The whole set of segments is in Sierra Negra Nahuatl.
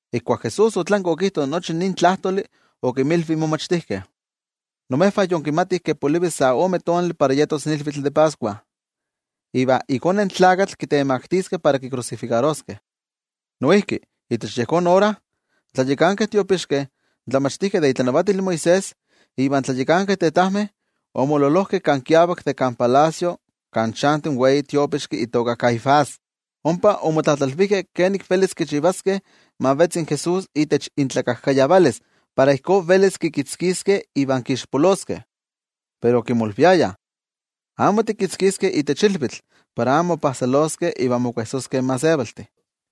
Ijkuak Jesús otlanki okijto nochi nin tlajtoli okinmilvi in momachtijkeh: —Imejvah yinkimatih ke polivi sa ome tonali para yetos ilvitl de Pascua. Iva iKone in Tlakatl kitemaktiskeh para kikrusifikaroskeh. Noijki itech yejón ora, in tlayakankeh tiopixkeh, in tlamachtijkeh de itlanavatil Moisés iva in tlayakankeh tetajmeh, omololojkeh kan kiavak de kan palacio kan chanti in wei tiopixki itoka Caifás. Ompa omotlatlalvijkeh kenik velis kichivaskeh ma vetzi in Jesús itech intlakajkayavalis para ijkó velis kikitzkiskeh iva kixpoloskeh. Pero okimolviayah: —Amo tikitzkiskeh itech ilvitl, para amo mopajsoloskeh in gentejtih.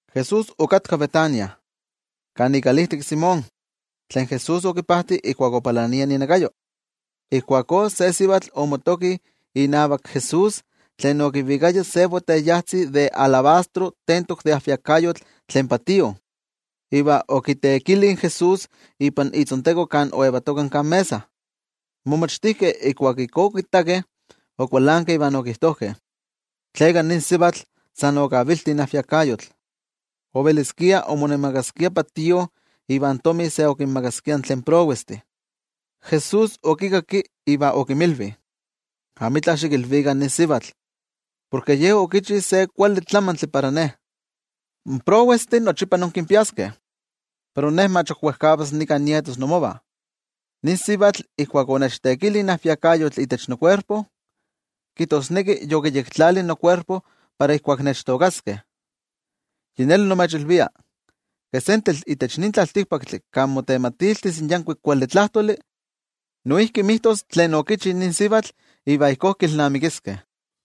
Jesús okatka Betania, kan ikalijtik in Simón, tlen Jesús okipajti ijkuak opalania inakayo. Ijkuakó se sivatl omotoki inavak Jesús tlen okivikaya se boteyajtzi de alabastro tentok de ajviakayotl tlen patío, iva okiteekili in Jesús ipan itzonteko kan oyetoka kan mesa. In momachtijkeh ijkuak ijkó okittakeh, okualankeh iva okijtojkeh: —¿Tleka nin sivatl san okavilti in ajviakayotl? Oveliskia omonemakaskia patío, iva in tomi se okinmakaskia tlen prowestih. Jesús okikakki iva okinmilvi: —Amitla xikilvikah nin sivatl. Porke ye okichi se kuali tlamantli para Ne. In prowestih nochipa inkinpiaskeh, pero Ne mach ok wejkavas nika nietos imovah. Nin sivatl ijkuak onechteekili ajviakayotl itech nokuerpo, kijtosneki yokiyektlali nokuerpo para ijkuak nechtookaskeh. Yi neli nimechilvia, ke sentetl itech nin tlaltikpaktli kan motematiltis in yankuik kuali tlajtoli, noijki mijtos tlen okichi nin sivatl iva ijkó kilnamikiskeh.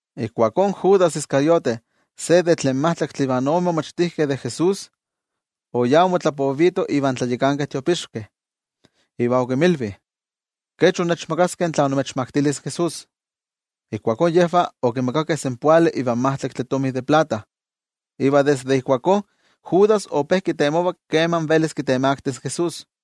Ijkuakó Judas Iscariote se de tlen majtlaktih ivan ome momachtijkeh de Jesús, oyá omotlapovito invan tlayakankeh tiopixkeh, iva okinmilvi: —¿Kech innechmakaskeh tla nimechmaktilis in Jesús? Ijkuakó yejvah okimakakeh senpoali ivan majtlaktli tomi de plata. Iva desde ijkuakó Judas ope kitemova keman velis kitemaktis in Jesús.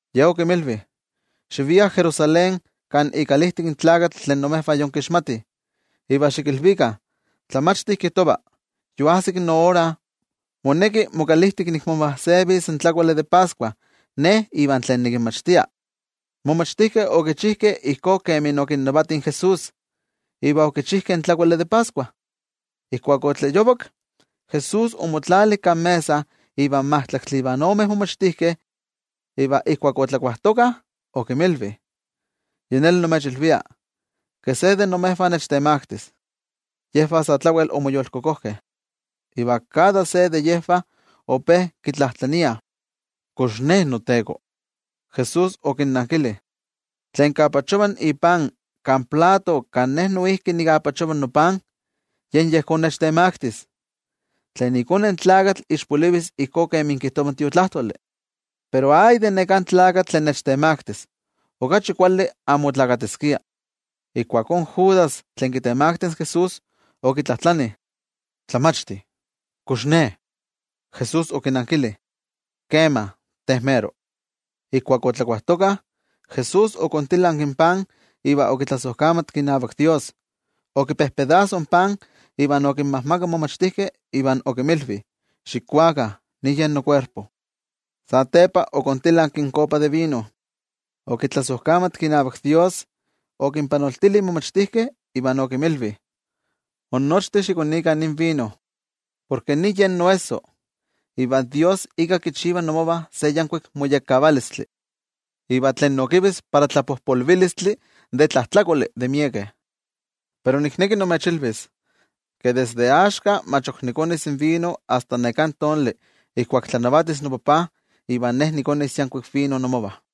Ye okinmilvi: —Xiviah Jerusalén kan ikalijtik in tlakatl tlen imejvah yinkixmatih, iva xikilvikah: “In Tlamachti kijtova: Yoajsik noora, moneki mokalijtik nikmomajsevis in tlakuali de Pascua Ne iva tlen nikinmachtia.” In momachtijkeh okichijkeh ijkó kemi okinnavati in Jesús, iva okichijkeh in tlakuali de Pascua. Ijkuak otlayovak, Jesús omotlali kan mesa ivan majtlaktli ivan ome momachtijkeh. Iva ijkuak otlakuajtokah okinmilvi: —Yi neli nimechilvia, ke se de imejvah nechtemaktis. Yejvah sa tlawel omoyolkokojkeh, iva kada se de yejvah ope kitlajtlaniah: —¿Kox ne, noTeko? Jesús okinnankili: —Tlen kapachova ipan kan plato kan Ne noijki nikapachova nopan, yen yejón nechtemaktis. Yi neli, iKone in Tlakatl ixpolivis ijkó kemi kijtova in Tiotlajkuiloli. Pero ¡ay de neká tlakatl tlen nechtemaktis! Okachi kuali amo onesiskia. Ijkuakó Judas tlen kitemaktis in Jesús, okitlajtlani: —Tlamachti, ¿kox ne? Jesús okinankili: —Kema, te mero. Ijkuak otlakuajtokah, Jesús okontilanki in pan iva okitlasojkamatki inavak Dios, okipojpostekki in pan iva okinmajmakak in momachtijkeh, iva okinmilvi: —Xikuakah, nin yen nokuerpo. Satepa okontilanki in kopa de vino, okitlasojkamatki inavak Dios, okinpanoltili in momachtijkeh, iva okinmilvi: —Innochtin xikonikah nin vino, porke nin yen noesso, iva Dios ika kichiva inmovah se yankuik moyekkavalistli, iva tlen nokivis para tlapojpolvilistli de tlajtlakoli de miekeh. Pero nikneki nimechilvis, ke desde axka mach ok nikonis vino asta neká tonali ijkuak tlanavatis noTajtzi iva ijkuakó nikonis yankuik vino inmovah.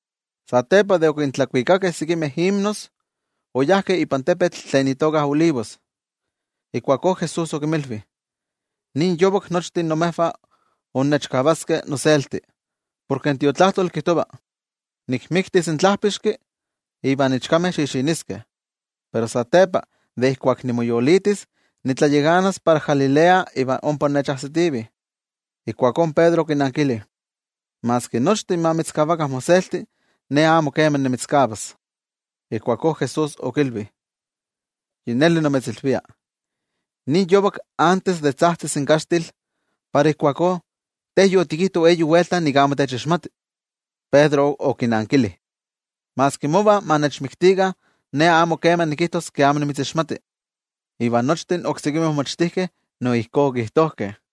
Satepa de okintlakuikakeh sekimeh himnos, oyajkeh ipan tepetl tlen itoka Olivos. Ijkuakó Jesús okinmilvi: —Nin yovak nochtin imejvah innechkavaskeh noselti, porke in Tiotlajkuiloli kijtova: “Nikmiktis in tlajpixki iva in ichkameh xixiniskeh.” Pero satepa de ijkuak nimoyolitis, nitlayakanas para Galilea iva ompa innechajsitivih. Ijkuakó Pedro okinankili: —Maski nochtin ma mitzkavakah moselti, ne amo kema nimitzkavas. Ijkuakó Jesús okilvi: —Yi neli nimitzilvia, nin yovak antes de tzajtzis in kaxtil, para ijkuakó te yotikijto eyi welta nik amo techixmati. Iva Pedro okinankili: —Maski mova ma nechmiktikah, ne amo kema nikijtos ke amo nimitzixmati. Iva nochtin oksekimeh momachtijkeh no ijkó okijtojkeh.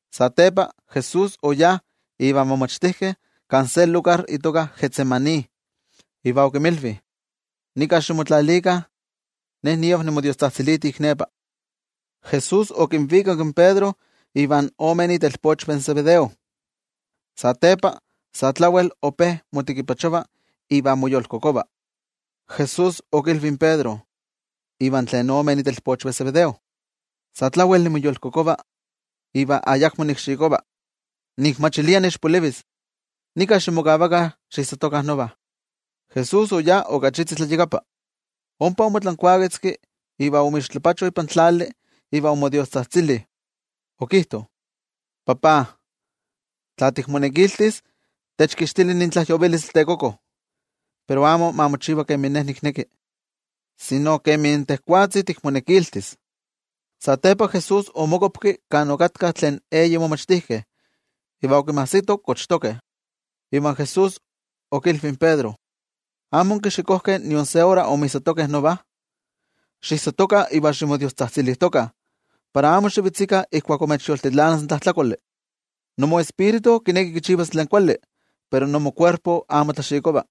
Satepa Jesús oyá invan momachtijkeh kan se lugar itoka Getsemaní, iva okinmilvi: —Nika ximotlalikah, ne niav nimodiostzajtziliti ik nepa. Jesús okivikak in Pedro ivan ome itelpochvah in Zebedeo. Satepa sa tlawel ope motekipachova iva moyolkokova. Jesús okilvi in Pedro iva tlen ome itelpochvah in Zebedeo: —Sa tlawel nimoyolkokova iva ayakmo nikxikova nikmachilia niixpolivis. Nika ximokavakah xiijsatokah nova. Jesús oyá ok achitzi tlayakapa, ompa omotlankuaketzki iva omixtlapacho ipan tlali, iva omodiostzajtzili okijto: —NoTajtzi, tla tikmonekiltis, techkixtili nin tlajyovilistli tekoko. Pero amo ma mochiva kemin Ne nikneki, sino kemi tejwatzi tikmonekiltis. Satepa Jesús omokuapki kan okatkah tlen eyi momachtijkeh, iva okinmajsito kochtokeh. Iva Jesús okilvi in Pedro: —¿Amo onkixikojkeh nion se ora inmijsatokeh nova? Xiijsatokah iva ximodiostzajtzilijtokah, para amo xivetzikah ijkuak imechyoltilanas in tlajtlakoli. Imotonal kineki kichivas tlen kuali, pero imokuerpo amo tlaxikova.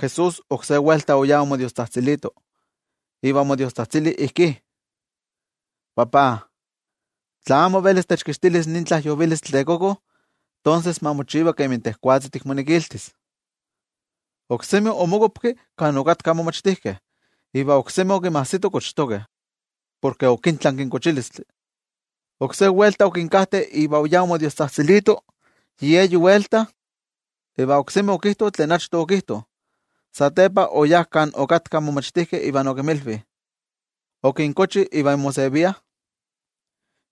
Jesús oksé welta oyá omodiostzajtzilito, iva omodiostzajtzili ijkí: —NoTajtzi, tla amo velis techkixtilis nin tlajyovilistli tekoko, tonses ma mochiva kemi tejwatzi tikmonekiltis. Oksemi omokuapki kan okatkah in momachtijkeh, iva oksemi okinmajsito kochtokeh, porke okintlanki in kochilistli. Oksé welta okinkajte iva oyá omodiostzajtzilito yi eyi welta, iva oksemi okijto tlen achto okijto. Satepa oyá kan okatkah in momachtijkeh iva okinmilvi: —¿Ok inkochih iva inmoseviah?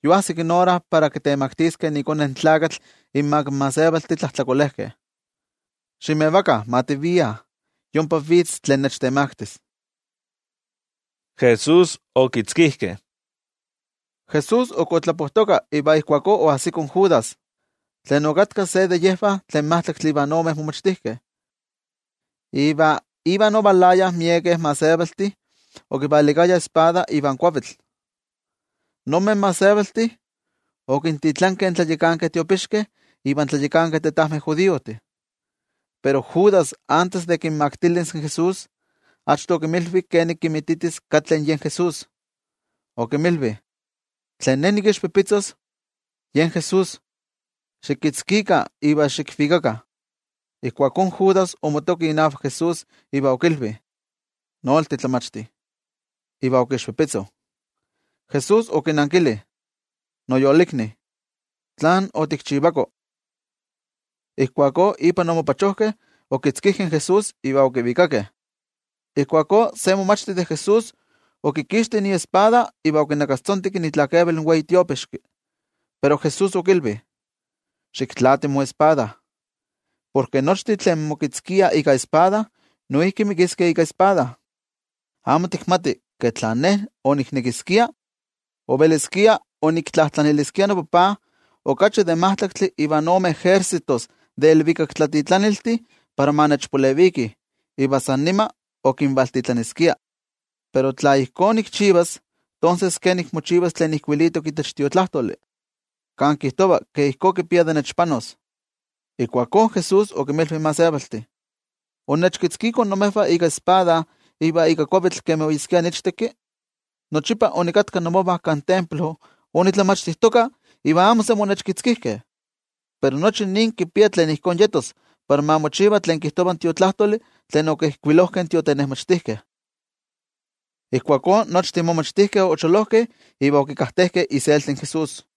Yoajsik ora para kitemaktiskeh iKone in Tlakatl inmak in gentejtih tlajtlakolejkeh. Ximevakah, ma tiviah. Yompa vitz tlen nechtemaktis. Jesús ok otlapojtoka iva ijkuakó oajsiko in Judas, tlen okatka se de yejvah tlen majtlaktli ivan ome momachtijkeh, iva ivan ovalayah miekeh gentejtih okivalikayah espada iva kuavitl. Nonmeh gentejtih okintitlankeh in tlayakankeh tiopixkeh iva in tlayakankeh tetajmeh judiojtih. Pero Judas antes de kinmaktilis in Jesús, achto okinmilvi kenik kinmititis katli yen Jesús. Okinmilvi: —Tlen ne nikixpipitzos, yen yejón Jesús. Xikitzkikah iva xikvikakah. Ijkuakó Judas omotoki inavak Jesús iva okilvi: —¡Nolti, Tlamachti! Iva okixpipitzo. Jesús okinankili: —Noyolikni, ¿tlán otikchivako? Ijkuakó ipan omopachojkeh, okitzkijkeh in Jesús iva okivikakeh. Ijkuakó se momachti de Jesús okixti iespada iva okinakastzonteki itlakeval in wei tiopixki. Pero Jesús okilvi: —Xiktlaati moespada. Porke nochtin tlen mokitzkiah ika espada, noijki mikiskeh ika espada. ¿Amo tikmati ke tla Ne oniknekiskia, oveliskia oniktlajtlaniliskia noTajtzi okachi de majtlaktli ivan ome ejércitos de ilvikaktlatitlaniltih para ma nechpalevikih iva san nima okinvaltitlaniskia? Pero tla ijkó nikchivas, ¿tonses kenik mochivas tlen ijkuilitok itech Tiotlajkuiloli, kan kijtova ke ijkó kipia de nechpanos? Ijkuakó Jesús okinmilvi in gentejtih: —¿Onnechkitzkikoh imejvah ika espada iva ika kuavitl kemi oyeskia niichteki? Nochipa onikatka imovah kan templo onitlamachtijtoka iva amo semi onnechkitzkijkeh. Pero nochi nin kipia tlen ijkó yetos para ma mochiva tlen kijtova in Tiotlajkuiloli tlen okijkuilojkeh in tiotenejmachtijkeh. Ijkuakó nochtin momachtijkeh ocholojkeh iva okikajtejkeh iselti in Jesús.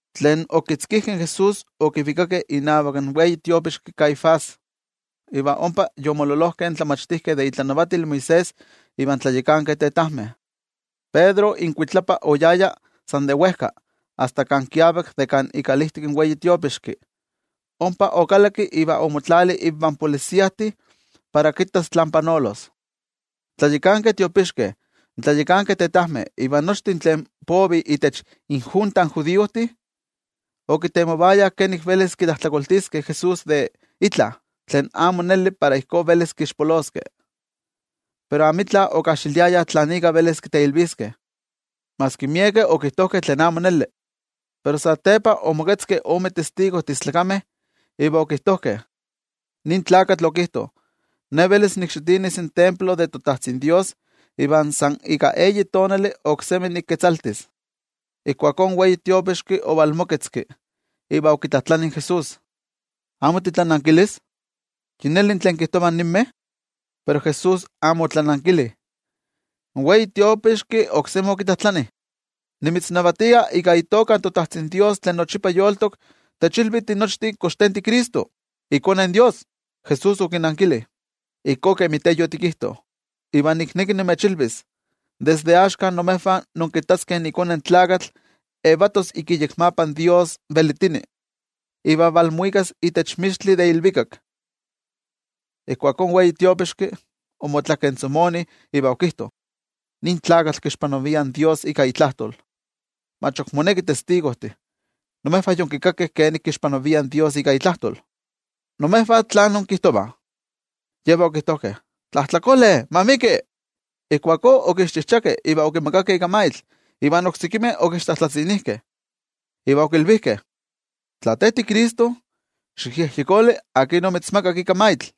Tlen okitzkijkeh in Jesús okivikakeh inavak in wei tiopixki Caifás, iva ompa yomololojkeh in tlamachtijkeh de itlanavatil Moisés ivan tlayakankeh tetajmeh. Pedro inkuitlapa oyaya san de wejka asta kan kiavak de kan ikalijtik in wei tiopixki, ompa okalakki iva omotlali invan templojmayoltih para kittas tlán panolos. In tlayakankeh tiopixkeh, in tlayakankeh tetajmeh iva nochtin tlen povih itech injunta in judiojtih, okitemovayah kenik velis kitlajtlakoltiskeh in Jesús de itla tlen amo neli para ijkó velis kixpoloskeh. Pero amitla okajxiliayah tlan ika velis kiteilviskeh, maski miekeh okijtojkeh tlen amo neli. Pero satepa omoketzkeh ome testigojtih istlakameh, iva okijtojkeh: —Nin tlakatl okijto: “Ne velis nikxitinis in templo de toTajtzin Dios, iva san ika eyi tonali oksemi niketzaltis.” Ijkuakó in wei tiopixki ovalmoketzki, iva okitlajtlani in Jesús: —¿Amo titlanankilis? ¿Yi neli tlen kijtovah ninmeh? Pero Jesús amo otlanankili. In wei tiopixki oksemi okitlajtlani: —Nimitznavatia ika itoka toTajtzin Dios tlen yolitok, techilvi tinochtin kox te tiCristo, iKone in Dios. Jesús okinankili: —Ijkó kemi te yotikijto. Iva nikneki nimechilvis desde axka imejvah inkittaskeh iKone in Tlakatl yetos ik iyekmapa in Dios tlen kipia nochi velitilistli, iva valmuikas itech mixtli de ilvikak. Ijkuakó in wei tiopixki, omotlakentzomoni iva okijto: —¡Nin tlakatl kixpanavia in Dios ika itlajtol! Mach ok monekih testigojtih. Imejvah yonkikakeh kenik kixpanavia in Dios ika itlajtol. ¿Imejvah tlán inkijtovah? Yejvah okijtojkeh: —¡Tlajtlakole, ma miki! Ijkuakó okixchijchakeh iva okimagakeh ika maitl, iva oksekimeh okixtlajtlatzinijkeh iva okilvijkeh: —Tla tiCristo, ¡xikyejyekoli akin omitzmagak ika maitl!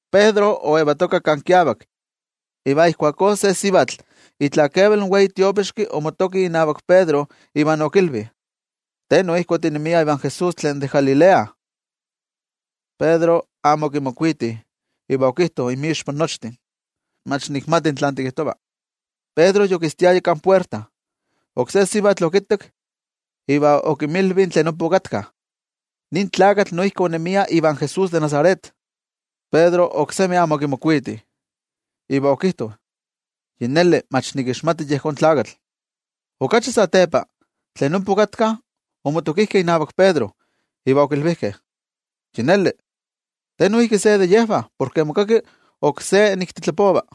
Pedro oyetoka kan kiavak, iva ijkuakó se sivatl itlakeval in wei tiopixki omotoki inavak Pedro iva okilvi: —Te noijki otinemia ivan Jesús tlen de Galilea. Pedro amo okimokuiti iva okijto inmixpa nochtin: —Mach nikmati tlán tikijtova. Pedro yokistiaya kan puerta, iva ijkuakó oksé sivatl okittak, iva okinmilvi tlen ompa okatkah: —Nin tlakatl noijki onemia ivan Jesús de Nazaret. Pedro oksemi amo okimokuiti, iva okijto: —Yi neli, mach nikixmati yejón tlakatl. Okachi satepa, tlen ompa okatkah omotokijkeh inavak Pedro, iva okilvijkeh: —Yi neli, te noijki se de yejvah, porke mokaki noijki ijkó nik titlapova.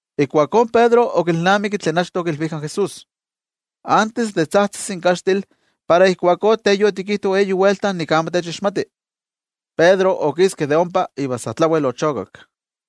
Ijkuakó Pedro okilnamiki tlen achto okilvijka in Jesús: “Antes de tzajtzis in kaxtil, para ijkuakó te yotikijto eyi welta nik amo techixmati.” Pedro okiski de ompa iva sa tlawel ochokak.